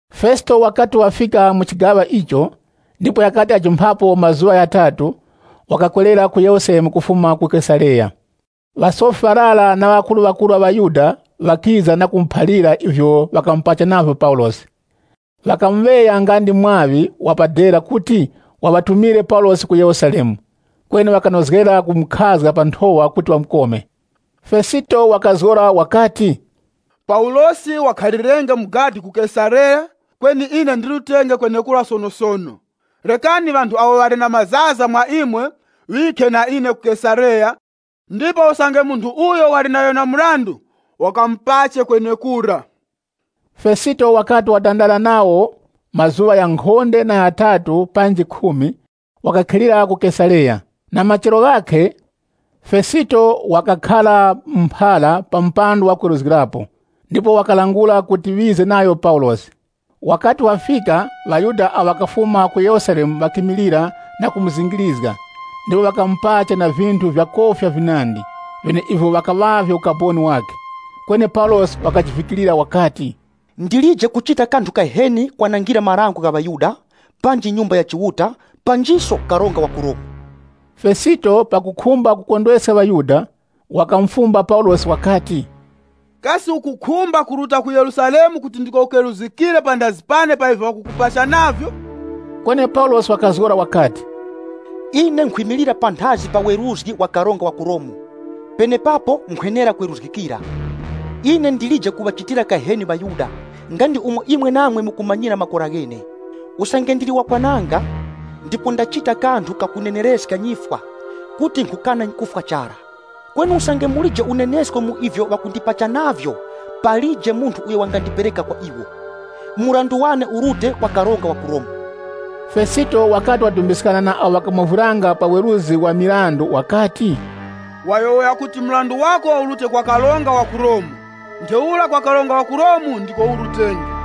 Fesito wakati wafika mu chigaŵa icho, ndipo ghakati ghajumphapo mazuŵa ghatatu, wakakwerera ku Yerusalemu kufuma ku Kesareya. Ŵasofi ŵarara na ŵakuruŵakuru ŵa ŵaYuda, ŵakiza na kumuphalira ivyo ŵakamupacha navyo Paulosi. Ŵakamuŵeya nga ndi mwaŵi wa pa dera kuti waŵatumire Paulosi ku Yerusalemu, kweni ŵakanozgera kumukhazga pa nthowa kuti ŵamukome. Fesito wakazgora wakati, “Paulosi wakhalirenge mu gadi ku Kesareya, kweni ine ndirutenge kwenekura sonosono. Rekani ŵanthu awo ŵali na mazaza mwa imwe ŵikhe na ine ku Kesareya, ndipo usange munthu uyo wali nayo na mrandu, ŵakamupache kwenekura.” Fesito wakati watandara nawo mazuŵa ghankhonde na ghatatu panji khumi, wakakhilira ku Kesareya. Na machero ghakhe, Fesito wakakhara mu mphara pa mupando wa kweruzgirapo, ndipo wakalangula kuti ŵize nayo Paulosi. Wakati wafika, ŵaYuda awo ŵakafuma ku Yerusalemu ŵakimilira na kumuzingirizga ndipo ŵakamupacha na vinthu vya kofya vinandi, vyeneivyo ŵakaŵavye ukaboni wakhe. Kweni Paulosi wakajivikirira wakati, “Ndilije kuchita kanthu kaheni kwanangira marango gha ŵaYuda, panji Nyumba ya Chiuta, panjiso karonga wa ku Romu.” Fesito pakukhumba kukondweska ŵaYuda, wakamufumba Paulosi wakati, “Kasi ukukhumba kuruta ku Yerusalemu kuti ndiko ukeruzgikire panthazi pane pa ivyo ŵakukupacha navyo?” Kweni Paulosi wakazgora wakati, “Ine nkhwimilira panthazi pa weruzgi wa karonga wa ku Romu, penepapo nkhwenera kweruzgikira. Ine ndilije kuŵachitira kaheni ŵaYuda, nga ndi umo imwe namwe mukumanyira makora ghene. Usange ndili wakwananga, ndipo ndachita kanthu kakunenereska nyifwa, kuti nkhukana kufwa chara. Kweni usange mulije unenesko mu ivyo ŵakundipacha navyo, palije munthu uyo wangandipereka kwa iwo. Mrandu wane urute kwa karonga wa ku Romu.” Fesito wakati wadumbiskana na awo ŵakamovwiranga pa weruzgi wa mirandu, wakati, “Wayowoya kuti mrandu wako urute kwa karonga wa ku Romu, ntheura kwa karonga wa ku Romu ndiko urutenge.”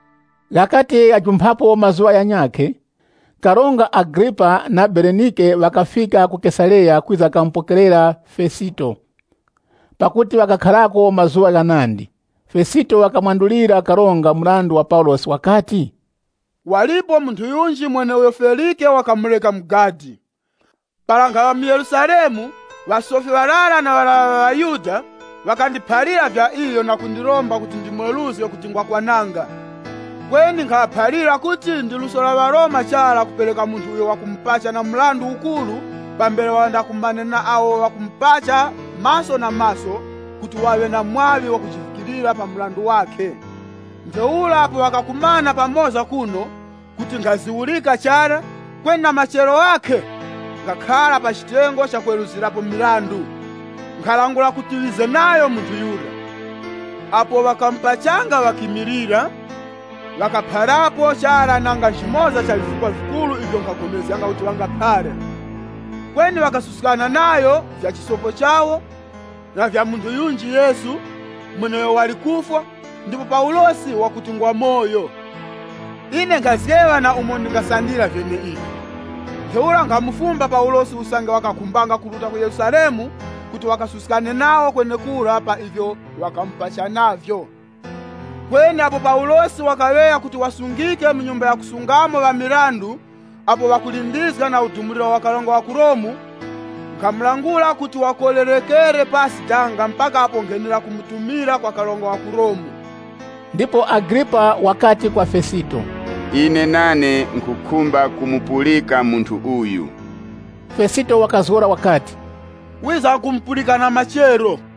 Ghakati ghajumphapo mazuŵa ghanyakhe, Karonga Agripa na Berenike ŵakafika ku Kesareya kwiza kamupokerera Fesito. Pakuti ŵakakharako mazuŵa ghanandi, Fesito wakamwandulira Karonga mrandu wa Paulosi wakati, “Walipo munthu yunji mweneuyo Felike wakamureka mu gadi. Para nkhaŵa mu Yerusalemu, ŵasofi ŵarara na ŵarara ŵa ŵaYuda, ŵakandiphalira vya iyo na kundiromba kuti ndimweruzge kuti ngwakwananga. Kweni nkhaŵaphalira kuti ndi luso la ŵaRoma chara kupereka munthu uyo ŵakumupacha na mrandu ukuru pambere wandakumane na awo ŵakumupacha maso na maso kuti waŵe na mwaŵi wakujivikirira pa mrandu wakhe. Ntheura apo ŵakakumana pamoza kuno, kuti nkhaziwurika chara, kweni na machero ghakhe, nkhakhara pa chitengo cha kweruzgirapo. Nkhalangula kuti ŵize nayo munthu yura. Apo ŵakamupachanga ŵakimilira, ŵakapharapo chara nanga nchimoza cha vifukwa vikuru ivyo nkhagomezganga kuti ŵangaphara. Kweni ŵakasuskana nayo vya chisopo chawo, na vya munthu yunji Yesu, mweneuyo wali kufwa, ndipo Paulosi wakuti ngwamoyo. Ine nkhazgeŵa na umo ndingasandira vyeneivi. Ntheura nkhamufumba Paulosi usange wakakhumbanga kuruta ku Yerusalemu kuti wakasuskane nawo kwenekura pa ivyo ŵakamupacha navyo. Kweni apo Paulosi wakaŵeya kuti wasungike mu nyumba yakusungamo ŵa mirandu, apo wakulindizga na udumuliro wa karonga wa ku Romu, nkhamulangula kuti wakolerekere pasi danga mpaka apo nkhenera kumutumira kwa karonga wa ku Romu.” Ndipo Agripa wakati kwa Fesito, “Ine nane nkhukhumba kumupulika munthu uyu.” Fesito wakazgora wakati, “Wizamkumupulika na machero.”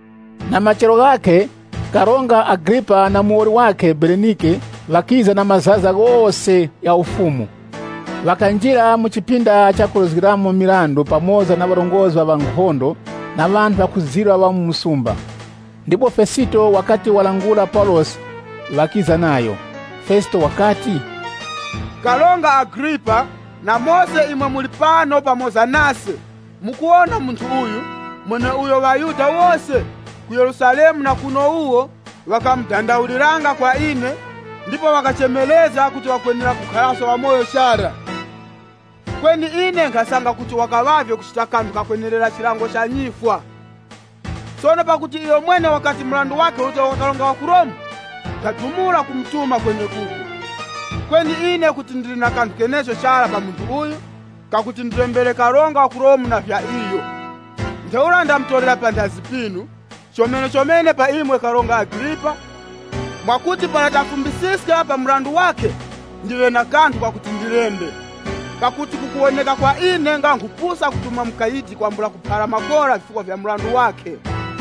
Na machero ghakhe, Karonga Agripa na muwoli wakhe Berenike, ŵakiza na mazaza ghose gha ufumu. Ŵakanjira mu chipinda cha kweruzgiramo mirandu pamoza na ŵarongozgi ŵa nkhondo, na ŵanthu ŵakuzirwa ŵa mu msumba. Ndipo Fesito wakati walangula Paulosi ŵakiza nayo. Fesito wakati, “Karonga Agripa, na mose imwe muli pano pamoza nase, mukuwona munthu uyu, mweneuyo ŵaYuda wose, ku Yerusalemu na kuno wuwo, ŵakadandaulanga nayo kwa ine, ndipo ŵakachemerezga kuti wakwenera kukharaso wamoyo chara. Kweni ine nkhasanga kuti wakaŵavye kuchita kanthu kakwenerera chilango cha nyifwa. Sono pakuti iyomwene wakati mrandu wakhe urute kwa karonga wa ku Romu, nkhadumula kumutuma kwenekuko. Kweni ine kuti ndili na kanthu kenecho chara pa munthu uyu, kakuti ndilembere karonga wa ku Romu na vya iyo. Ntheura ndamutorera panthazi pinu, chomenechomene pa imwe Karonga Agripa, mwakuti para tamufumbisiska pa mrandu wakhe, ndiŵe na kanthu kakuti ndilembe. Pakuti kukuwoneka kwa ine nga nkhupusa kutuma mukayidi kwambula kuphara makora vifukwa vya mrandu wakhe.”